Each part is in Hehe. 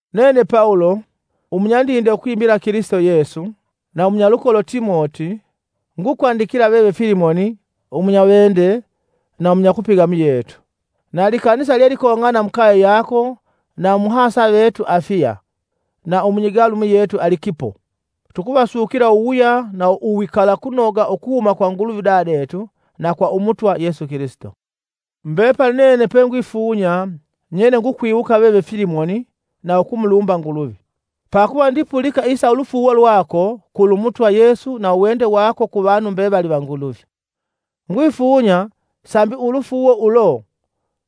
Nene Pawulo, umunyandinde ukwimila Kilisito Yesu, na umunyalukolo Timoti, ngukwandikila veve Filimoni, umunyawende na umunyakupiga muyetu, na likanisa lyelikong'ana mukaye yako na umuhasa vetu Afiya, na umunyigalu muyetu Alikipo. Tukuvasukila uwuwuya na uwikalakunoga ukuhuma kwa Nguluvi Udadetu, na kwa Umutwa Yesu Kilisito. Mbepali nene pengwifunya, nyele ngukwiwuka veve Filimoni, na ukumulumba, Nguluvi. Pakuva ndipulika isa ulufuuwo lwako kulu Umutwa Yesu na uwende wako kuvanu mbevali va Nguluvi. Ngwifunya sambi ulufuuwo ulo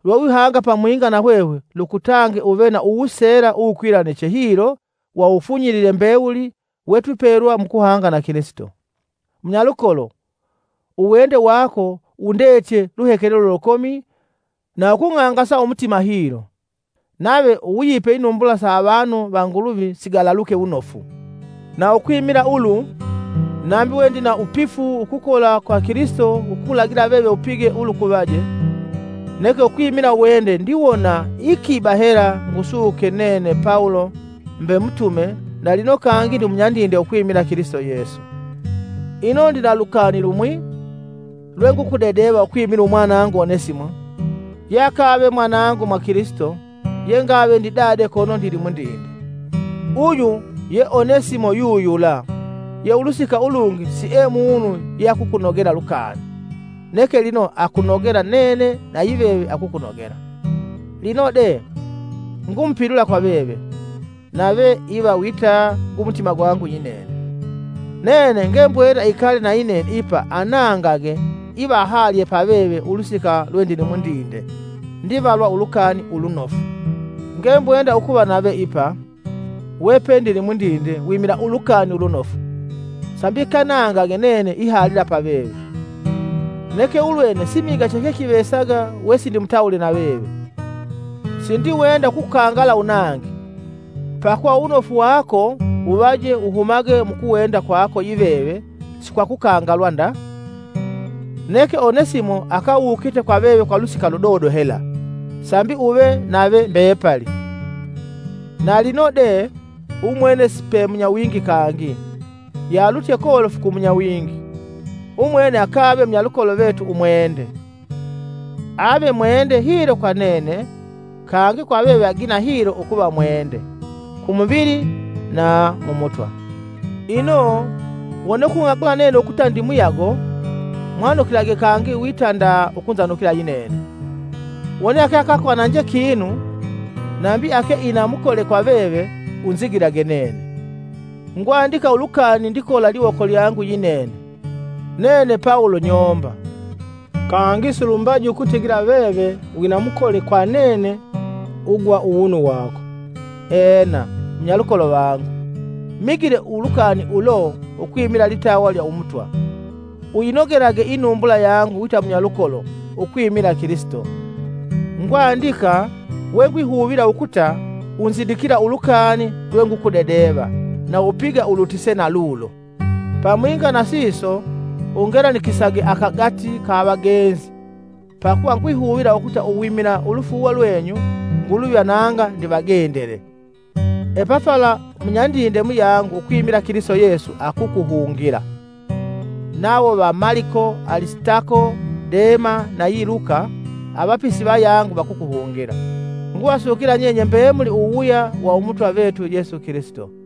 lwewihanga pamwinga na hwehwe lukutange uve na uwuseela uwukwilaniche hilo wa uwufunyilile mbewuli wetwipelwa mukuhanga na Kilisito. Munyalukolo, uwende wako wundetye luhekelelo lukomi na ukung'angasa umutima na hilo! Nave uwuyipe inumbula sa avanu va Nguluvi sigalaluke wunofu. Na ukwimila ulu, nambi we ndina wupifu ukukola kwa Kilisito ukukulagila veve upige ulukuvaje, neke ukwimila uwende ndiwona iikiba hela ngusuke nene Pawulo mbe mutume na lino kangi munyandinde ukwimila Kilisito Yesu. Ino ndina lukani lumwi lwengukudedeva ukwimila umwanangu Onesimo ye akave mwanangu mwa Kilisito ye ngave ndidade kono ndilimundinde. Uyu ye Onesimo yuyula ye ulusika ulungi sie munu yeakukunogela lukani, neke lino akunogela nene na yiveve akukunogela. Lino de, ngumupilula kwa veve, nave iva wita gumutima gwangu yinene, Nene ngembwenda ikale nayinene ipa anangage iva ahalye paveve ulusika lwe ndili mundinde ndivalwa Ulukani Ulunofu. Ngembwenda ukuva nave ipa, wepe ndilimundinde wimila Ulukani Ulunofu, sambi keanange nene peke uva veve. Neke ulwene simiga chechekivesaga wesindimutawule na veve, sindiwenda ukukukangala unange, pakuva uwunofu wako wuvaje wuhumage mukuwenda kwako yiveve si kwa kukangalwa nda. Neke Onesimo akawukite kwa veve kwa ulusika ludodo hela, sambi uve nave mbepali. Na lino de, umwene sipe munyawingi kangi, yealutye kolofu ku munyawingi; umwene akave munyalukolo vetu umwende. Ave mwende hilo kwa nene, kangi kwa veve agina hilo ukuva mwende, ku muvili na mu Mutwa. Ino, wone ukung'agula nene ukuta ndi muyago, mwanukilage kangi wita nda ukunzanukila yinene. Wone ake akakwananje kinu, nambi ake ina mukole kwa veve, usigilage nene. Ngwandika ulukani ndikola liwoko lyangu yinene; Nene Pawulo nyoomba! (Kangi silumbaji ukutigila veve wina mukole kwa nene ugwa uwunu wako.) Ena, munyalukolo vangu, migile ulukani ulo ukwimila litawa lya Umutwa: Uyinogelage inumbula yangu wita munyalukolo ukwimila Kilisito. Ngwandika wengwihuvila ukuta unzidikila ulukani lwengukukudedeva na upiga ulutise na lulo. Pamwinga na siso, ungelanisisage akagati ka avagenzi pakuva ngihuvila ukuta uwimila ulwifunyo lwenyu, Nguluvi ananga ndivagendele. Epafala umunyandinde muyangu ukwimila Kilisito Yesu, akukuhungila. Nawo va Maliko, Alisitako, Dema nayi Luka, avapisi vayangu, vakukuhungila. Nguvasukila nyenye mbemuli uwuwuya wa Umutwa vetu Yesu Kilisito.